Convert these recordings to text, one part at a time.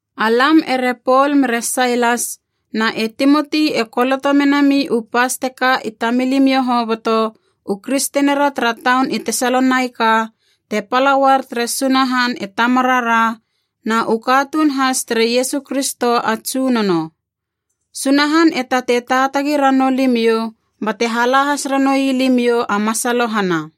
Alam ere Pol mere Sailas na e Timoti e koloto menami u pas teka i tamilimiou hoboto, u kristenira tara taun i Tesalonaika te pala uar tere Sunahan e Tamarara, na u katuun has tere Iesu Kristo a Tsunono. Sunahan e tatei taatagi ranou limiou bate hala has ranoui limiou a masalohana.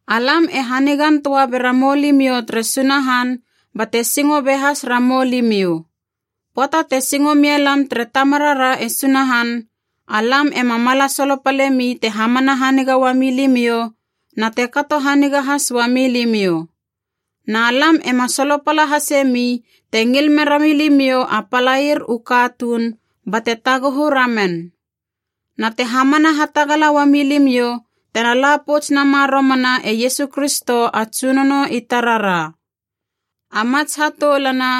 Alam e hanigan töa bera mou limiou tere Sunahan bate singo be has ramou limiou. Pöata te singo mialam tere Tamarara e Sunahan, alam ema mala solopalemi te hamana haniga uami limiou na te kato haniga has uami limiou. Na lam ema solopala hasemi te ngil mera milimiou a palair u katuun bate taguhu ramen. Na te hamana hatagala uami limiou tena la pouts nama romana e Iesu Kristo a Tsunono i tarara. A mats hatoulana,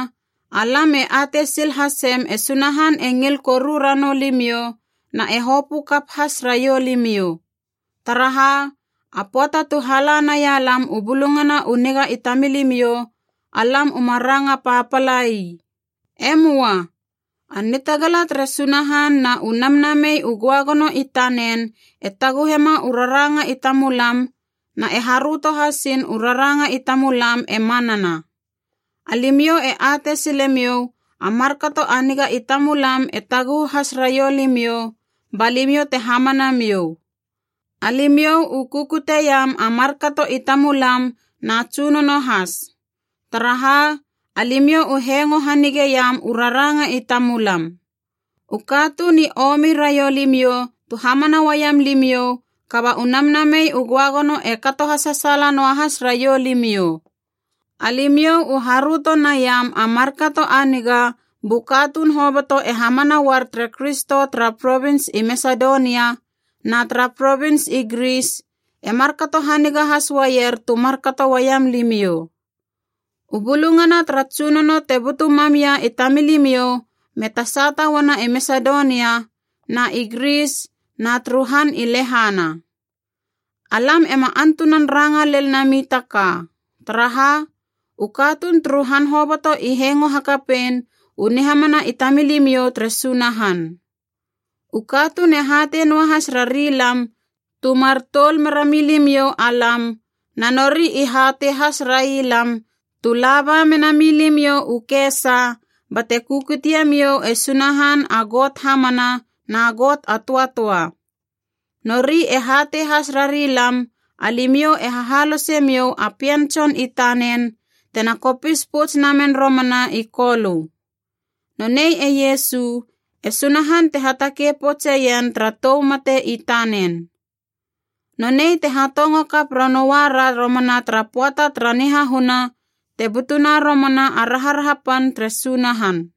alam e atei sil hasem e Sunahan e ngil koru ranou limiou na e hopö kap has raiou limiou. Taraha a pöata tu hala naia lam u Bulungana u Niga i tamilimiou, alam uma ranga papala ii. E möa. A nitagala tere Sunahan na u Namnamei u Göagono i tanen e taguhema u raranga i tamulam, na e haröto hasiin u raranga i tamulam e manana. Alimiou e atei silemiou a markato a niga i tamulam e taguhu has raiou limiou ba limiou te hamana miou. Alimiou u kukuteiam a markato i tamulam na Tsunono has. Taraha, alimiou u hengo hanigeiam u raranga i tamulam. U katuun i omi raiou limiou tu hamana uaiam limiou, kaba u Namnamei u Göagono e kato hasasaala noahas raiou limiou. Alimiou u haröto naiam a markato a niga bu katuun hoboto e hamana uar tere Kristo tara provins i Masedonia na tara provins i Gris e markato haniga has uaier tu markato uaiam limiou. U bulungana tara Tsunono te butu mam ia i tamilimiou me tasata uana i Masedonia na i Gris na turu han i lehana. Alam ema antunan ranga lel nami ta ka, taraha u katuun turu han hoboto i hengo hakapein u nihamana i tamilimiou tere Sunahan. U katuun e hatei noahas rari lam tu mar toul mera milimiou alam, na nori i hatei has rai lam tu laba menami limiou u kesa bate kukutie miou e Sunahan a Got hamana na Got a töatöa. Nori e hatei has rari lam, alimiou e hahalosemiou a Pien Tson i tanen, tena kopis pouts namen romana i Kolö. Nonei e Iesu, e Sunahan te hatakei poutseien tara tou mate i tanen. Nonei te hatongo kap ranoua ra romana tara pöata tara nihahuna, te butuna romana a raharaha pan tere Sunahan.